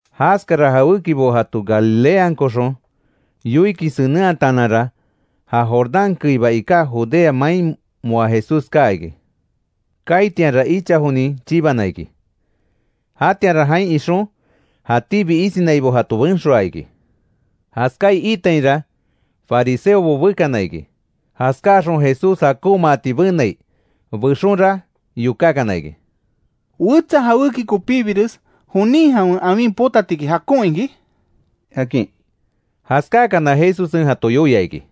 Jaskara jawékibo jato Galileankoxon yoikin senenhataananra, ja Jordán keiba iká Judea main moa Jesús kaa iki. Kaitianra icha jonin chibana iki. Jatianra jain ixon, jatíbi isinaibo jato benxoaa iki. Jaskaai iitainra, fariseobo bekana iki jaskáaxon Jesús jakonmaati benai. Bexonra yokákana iki: —¿Wetsa jawéki kopíbires jonin jawen awin potatiki jakon iki? —akin. Jaskáakana, Jesussen jato yoia iki: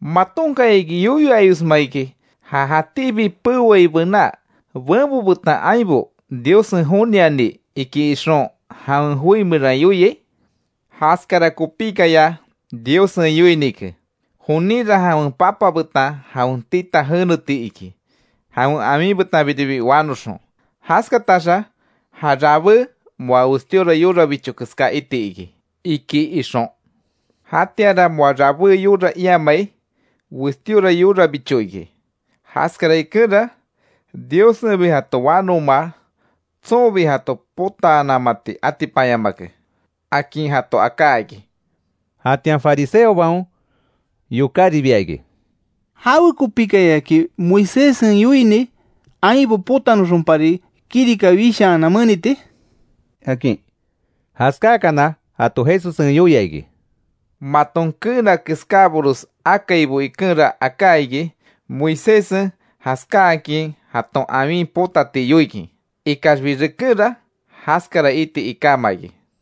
—¿Matonkayaki yoyo ayosma iki, ja jatíbi peoai bená, ‘benbo betan ainbo Diossen joniani’, iki ixon jawen joi meran yoiai? Jaskara kopíkaya Diossen yoinike: ‘Joninra jawen papa betan jawen tita jeneti iki, jawen awin betanbiribi wanoxon, jaskataxa ja rabé moa westíora yorabicho keská iti iki’, iki ixon. Jatianra moa rabé yora iamai, westíora yorabicho iki. Jaskara ikenra, Diossenbi jato wanomaa, tsonbi jato potaanamati atipanyamake —akin jato aká iki. Jatian fariseobaon yokáribia iki: —¿Jawekopíkayaki Moiséssen yoini, ainbo potanoxonpari kirika wishaanan meniti? —akin. Jaskáakana, jato Jesussen yoia iki: —Maton keena keskábores akaibo ikenra aká iki Moiséssen jaskáakin jaton awin potati yoikin. Ikaxbi rekenra, jaskara iti ikáma iki.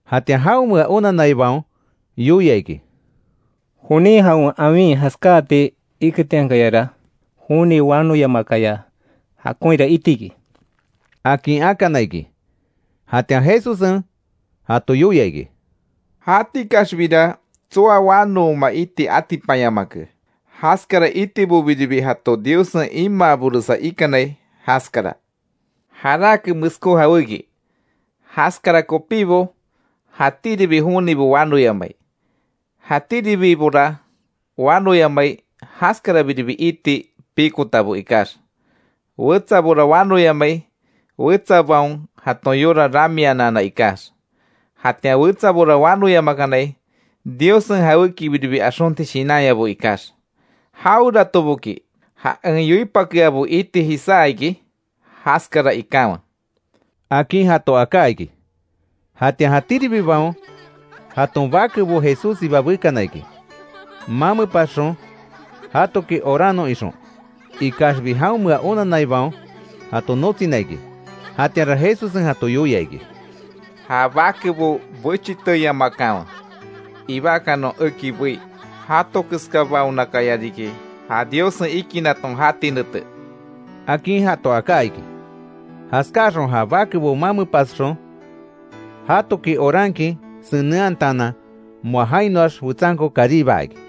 Jatian jaonmea onanaibaon yoia iki: —Jonin jawen awin jaskáati iketiankayara, joni wanoyamaakaya jakonhira iti iki —akin akana iki. Jatian Jesussen jato yoia iki: —Jatikaxbira tsoa wanooma iti atipanyamake. Jaskara itibobiribi jato Diossenbi imaaboresa ikanai jaskara. Jarake meskó jawéki, jaskara kopíbo jatíribi jonibo wanoyamai. Jatiribora wanoyamai, jaskarabiribi iti pikotabo ikax. Wetsabora wanoyamai, wetsabaon jaton yora ramianana ikax. Jatian wetsabora wanoyamakanai, Diossen jawékibiribi axonti shinanyabo ikax. Jaweratoboki, ja en yoipakeabo iti jisá iki, jaskara ikanwe —akin jato aká iki. Jatian jatíribibaon, jaton bakebo Jesússiba bekana iki, mamepasxon jatoki oranon ixon. Ikaxbi jaonmea onanaibaon jato notsina iki. Jatianra Jesussen jato yoia iki: —Ja bakebo bechiteyamakanwe, ibakanon eki bei. Jato keskabaonakaya riki ja Diossen ikinaton jati nete —akin jato aká iki. Jaskáaxon ja bakebo mamepasxon jatoki orankin senenhataanan, moa jainoax wetsanko karibaa iki.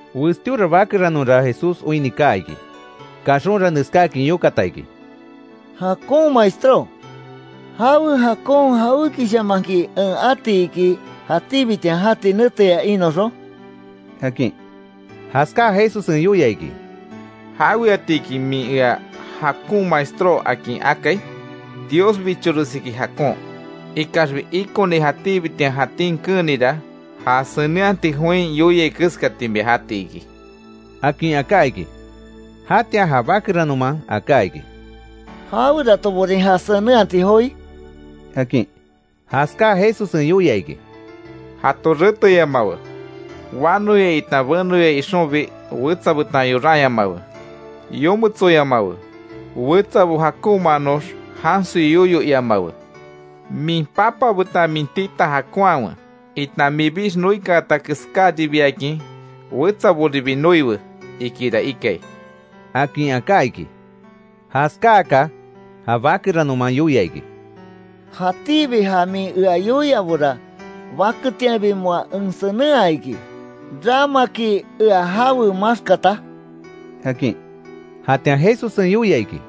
Westíora bakeranonra Jesús oinni kaa iki, kaxonra neskáakin yokata iki: —Jakon maestró ¿Jawe jakon jawékishamanki en ati iki, jatíbitian jati neteya inoxon? —akin. Jaskaa Jesussen yoia iki: —¿Jaweatiki min ea jakon maestró, akin akai? Dios bichoresiki jakon. Ikaxbi, ikoni jatíbitian jatín keenira, ja senenhati join yoiai keskati mia jati iki —akin aká iki. Jatian ja bakeranoman aká iki: —¿Jaweratoborin, ja senenhati joi? —akin. Jaskáa Jesussen yoia iki: —‘Jato reteyamawe; wanoya itan benoya ixonbi, wetsa betan yoranyamawe; yometsoyamawe; wetsabo jakonmaanox jansoi yoyo iamawe. Min papa betan min tita jakonhawe, itan minbix noikaata keskáribiakin, wetsaboribi noiwe, ikira ikai’ —akin aká iki. Jaskaaka, ja bakeranonman yoia iki: —Jatíbi ja min ea yoiabora, baketianbi moa en senenhaa iki, ¿Ramaki ea jawe maxkata? —akin. Jatian Jesussen yoia iki: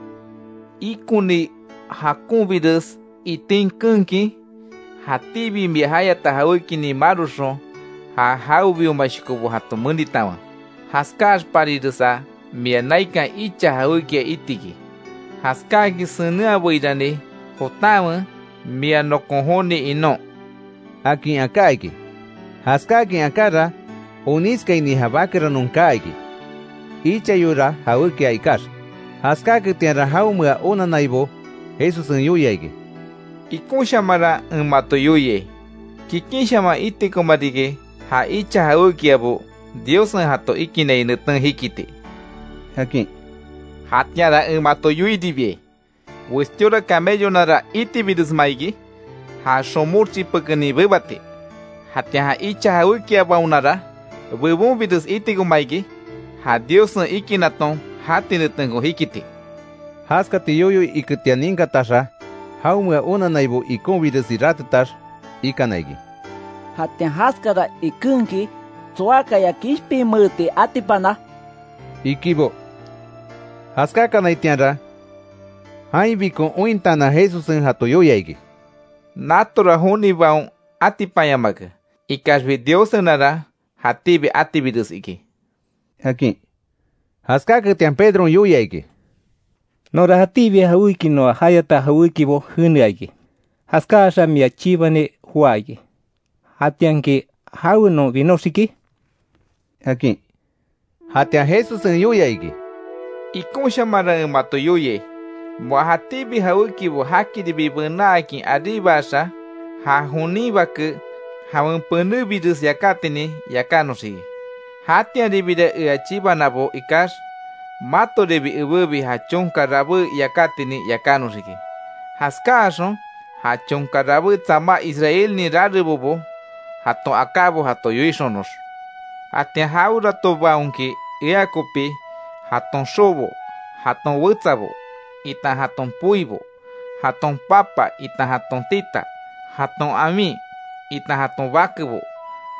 —Ikoni jakonbires itin keenkin, jatíbi mia jayata jawékinin maroxon, ja jawebiomashokobo jato menitanwe. Jaskáaxpariresa, mia naikan icha jawékia itiki. Jaskáakin senenhabeirani, jotanwe mia nokon joni inon —akin aká iki. Jaskáakin akára, onískaini ja bakeranon kaa iki, ichayora jawékia ikax. Jaskáaketianra jaonmea onannaibo Jesussen yoia iki: —Ikonshamanra en mato yoiai, kikinshaman itikoma riki, ja icha jawékiabo, Diossen jato ikinai neten jikiti —akin. Jatianra en mato yoiribiai: Westíora camellonara itibiresma iki, ja xomox chipekenin bebati, jatian ja icha jawékiabaonara bebonbires itikoma iki ja Diossen ikinaton jati netenko jikiti. Jaskati yoyo iketian ninkataxa jaonmea onannaibo ikonbiresi ratetax ikana iki: —Jatian jaskara ikenki ¿Tsoakaya kishpinmeeti atipana? —ikibo. Jaskákanaitianra, jainbikon ointaanan Jesussen jato yoia iki: —Natora jonibaon atipanyamake, ikaxbi Diossenara jatíbi atibires iki —akin. Jaskáketian Pedron yoia iki: —Nonra, jatíbi noa jayata jawékibo jenea iki. Jaskáaxa mia chibani joá iki. Jatianki ¿Jawe non binoxiki? —akin. Jatian Jesussen yoia iki: —Ikonshamanra en mato yoiai, moa jatíbi jawékibo jakiribi benaakin aríbaxa, ja jonin Bake jawen penébires yakátinin yakánoxiki. Jatianribira ea chibanabo ikax, matoribi ebébi ja chonka rabé yakátinin yakánoxiki, jaskáaxon ja chonka rabé tsamá Israelnin rarebobo jaton akábo jato yoixonox. Jatian jaweratobaonki ea kopi, jaton xobo, jaton wetsabo itan jaton poibo, jaton papa itan jaton tita, jaton awin itan jaton bakebo,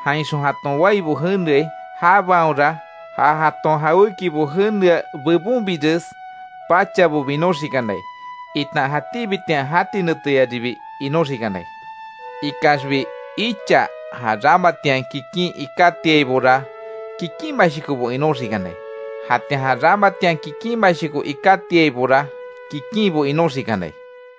jainxon jaton waibo jeneai; jabaonra ja jaton jawékibo jenea bebonbires pachabo binoxikanai, itan jatíbitian jati neteyaribi inoxikanai. Ikaxbi icha ja ramatian kikin ikátiaibora kikinmashokobo inoxikanai, jatian ja ramatian kikinmashoko ikátiaibora kikinbo inoxikanai.